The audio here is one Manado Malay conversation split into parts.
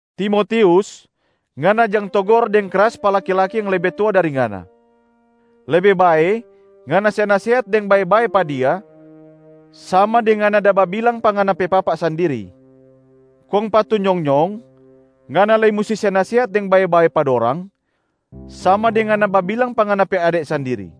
Timotius, ngana jang togor deng kras pa laki-laki yang lebe tua dari ngana. Lebe bae ngana se nasehat deng bae-bae pa dia sama deng ngana da babilang pa ngana pe papa sandiri. Kong pa tu nyong-nyong, ngana lei musti se nasehat deng bae-bae pa dorang sama deng ngana babilang pa ngana pe ade sandiri.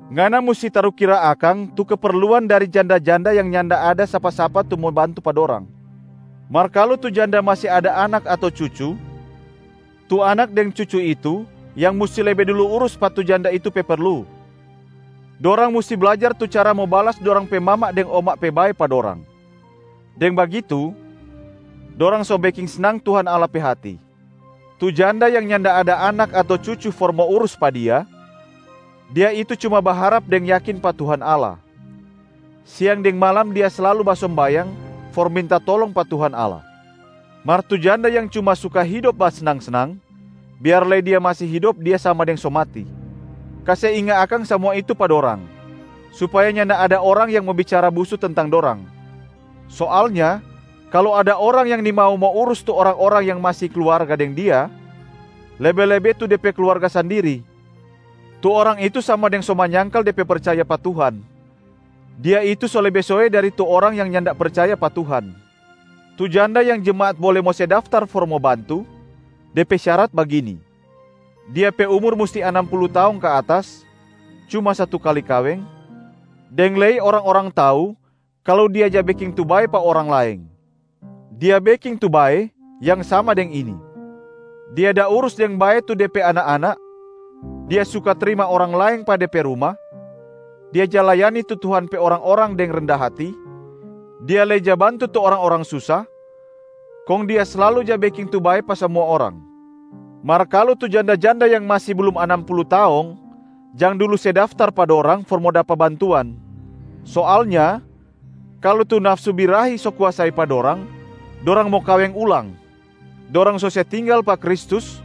Ngana musti tarukira akang tu keperluan dari janda-janda yang nyanda ada sapa-sapa tu mo bantu pa dorang. Mar kalu tu janda masi ada anak ato cucu, tu anak deng cucu itu yang musti lebe dulu urus pa tu janda itu pe perlu. Dorang musti blajar tu cara mo balas dorang pe mama deng oma pe bae pa dorang. Deng bagitu, dorang so beking snang Tuhan Allah pe hati. Tu janda yang nyanda ada anak ato cucu for mo urus pa dia, dia itu cuma baharap deng yakin pa Tuhan Allah. Siang deng malam dia slalu basombayang for minta tolong pa Tuhan Allah. Mar tu janda yang cuma suka hidop basnang-snang, biar lei dia masi hidop dia sama deng so mati. Kase inga akang samua itu pa dorang, supaya nyanda ada orang yang mo bicara busu tentang dorang. Soalnya kalu ada orang yang nimau mo urus tu orang-orang yang masi kluarga deng dia, lebe-lebe tu de pe kluarga sandiri, tu orang itu sama deng so manyangkal de pe percaya pa Tuhan. Dia itu so lebe soe dari tu orang yang nyanda percaya pa Tuhan. Tu janda yang jemaat bole mo se daftar for mo bantu, de pe syarat bagini: Dia pe umur musti anam pulu taong ka atas, cuma satu kali kaweng, deng lei orang-orang tau kalu dia ja beking tu bae pa orang laeng. Dia beking tu bae yang sama deng ini: dia da urus deng bae tu de pe anak-anak, dia suka trima orang laeng pa de pe ruma, dia ja layani tu Tuhan pe orang-orang deng renda hati, dia lei ja bantu tu orang-orang susa, kong dia slalu ja beking tu bae pa samua orang. Mar kalu tu janda-janda yang masi blum anam pulu taong, jang dulu se daftar pa dorang for mo dapa bantuan. Soalnya kalu tu nafsu birahi so kuasai pa dorang, dorang mo kaweng ulang. Dorang so se tinggal pa Kristus,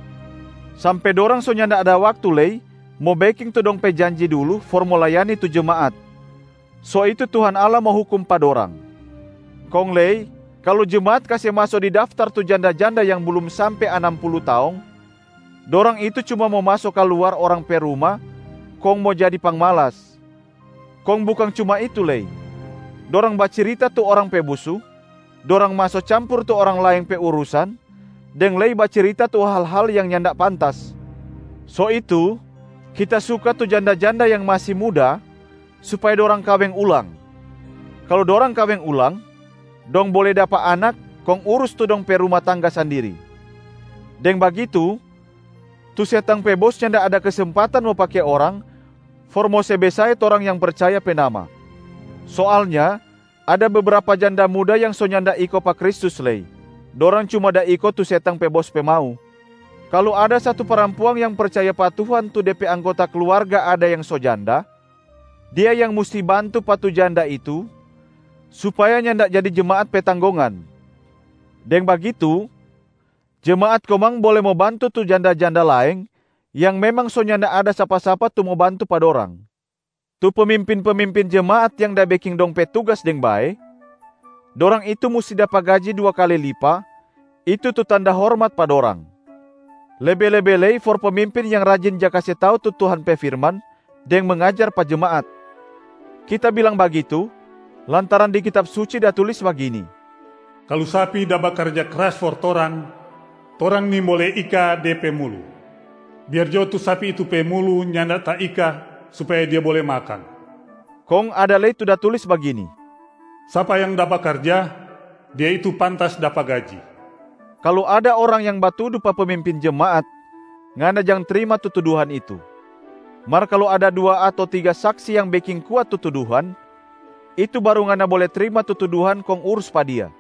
sampe dorang so nyanda ada waktu lei mo beking tu dong pe janji dulu for mo layani tu jemaat. So itu Tuhan Allah mo hukum pa dorang. Kong lei kalu jemaat kase maso di daftar tu janda-janda yang blum sampe anam pulu taong, dorang itu cuma mo maso kaluar orang pe ruma kong mo jadi pangmalas. Kong bukang cuma itu lei, dorang bacirita tu orang pe busu, dorang maso campur tu orang laeng pe urusan deng lei bacirita tu hal-hal yang nyanda pantas. So itu kita suka tu janda-janda yang masi muda supaya dorang kaweng ulang. Kalu dorang kaweng ulang, dong bole dapa anak kong urus tu dong pe ruma tangga sandiri. Deng bagitu tu setang pe bos nyanda ada kesempatan mo pake orang for mo se besae torang yang percaya pe nama. Soalnya ada bebrapa janda muda yang so nyanda iko pa Kristus lei, dorang cuma da iko tu setang pe bos pe mau. Kalu ada satu parampuang yang percaya pa Tuhan tu de pe anggota kluarga ada yang so janda, dia yang musti bantu pa tu janda itu supaya nyanda jadi jemaat pe tanggongan. Deng bagitu jemaat komang bole mo bantu tu janda-janda laeng yang memang so nyanda ada sapa-sapa tu mo bantu pa dorang. Tu pemimpin-pemimpin jemaat yang da beking dong pe tugas deng bae, dorang itu musti dapa gaji dua kali lipa, itu tu tanda hormat pa dorang. Lebe-lebe lei for pemimpin yang rajin ja kase tau tu Tuhan pe firman deng mangajar pa jemaat. Kita bilang bagitu lantaran di Kitab Suci da tulis bagini, “Kalu sapi da bakarja kras for toranga, torang nimbole ika de pe mulu, biar jo tu sapi itu pe mulu nyanda taika supaya dia bole makang.” Kong ada lei tu da tulis bagini, “Sapa yang da bakarja, dia itu pantas dapa gaji.” Kalu ada orang yang batudu pa pemimpin jemaat, ngana jang trima tu tuduhan itu. Mar kalu ada dua ato tiga saksi yang beking kuat tu tuduhan, itu baru ngana bole trima tu tuduhan kong urus pa dia.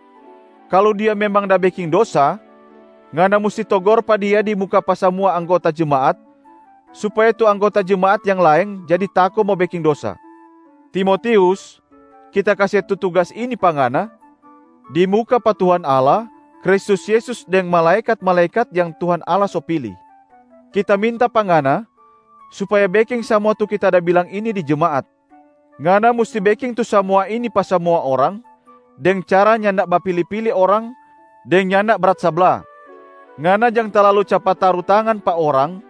Kalu dia memang da beking dosa, ngana musti togor pa dia di muka pa samua anggota jemaat supaya tu anggota jemaat yang laeng jadi tako mo beking dosa. Timotius, kita kase tu tugas ini pa ngana di muka pa Tuhan Allah, Kristus Yesus deng malaekat-malaekat yang Tuhan Allah so pili. Kita minta pa ngana supaya beking samua tu kita da bilang ini di jemaat. Ngana musti beking tu samua ini pa samua orang deng cara nyanda bapili-pili orang deng nyanda brat sabla. Ngana jang talalu capat taru tangan pa orang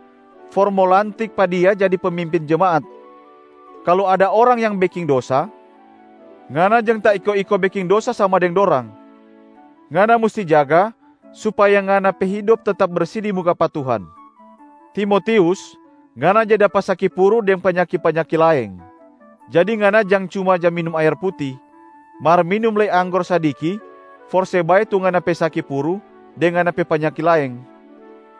for mo lantik pa dia jadi pemimpin jemaat. Kalu ada orang yang beking dosa, ngana jang taiko-iko beking dosa sama deng dorang. Ngana musti jaga supaya ngana pe hidop tetap bersi di muka pa Tuhan. Timotius, ngana ja dapa saki puru deng panyaki-panyaki laeng. Jadi ngana jang cuma ja minum aer puti, mar minum lei anggor sadiki for se bae tu ngana pe saki puru deng ngana pe panyaki laeng.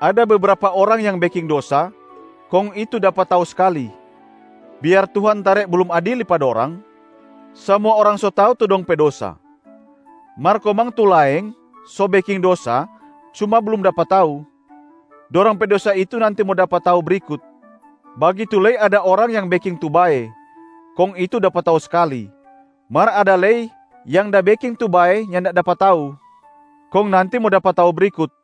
Ada bebrapa orang yang beking dosa, kong itu dapa tau skali. Biar Tuhan tare blum adili pa dorang, samua orang so tau tu dong pe dosa. Mar komang tu laeng so beking dosa, cuma blum dapa tau. Dorang pe dosa itu nanti mo dapa tau brikut. Bagitu lei ada orang yang beking tu bae, kong itu dapa tau skali. Mar ada lei yang da beking tu bae nyanda dapa tau, kong nanti mo dapa tau brikut.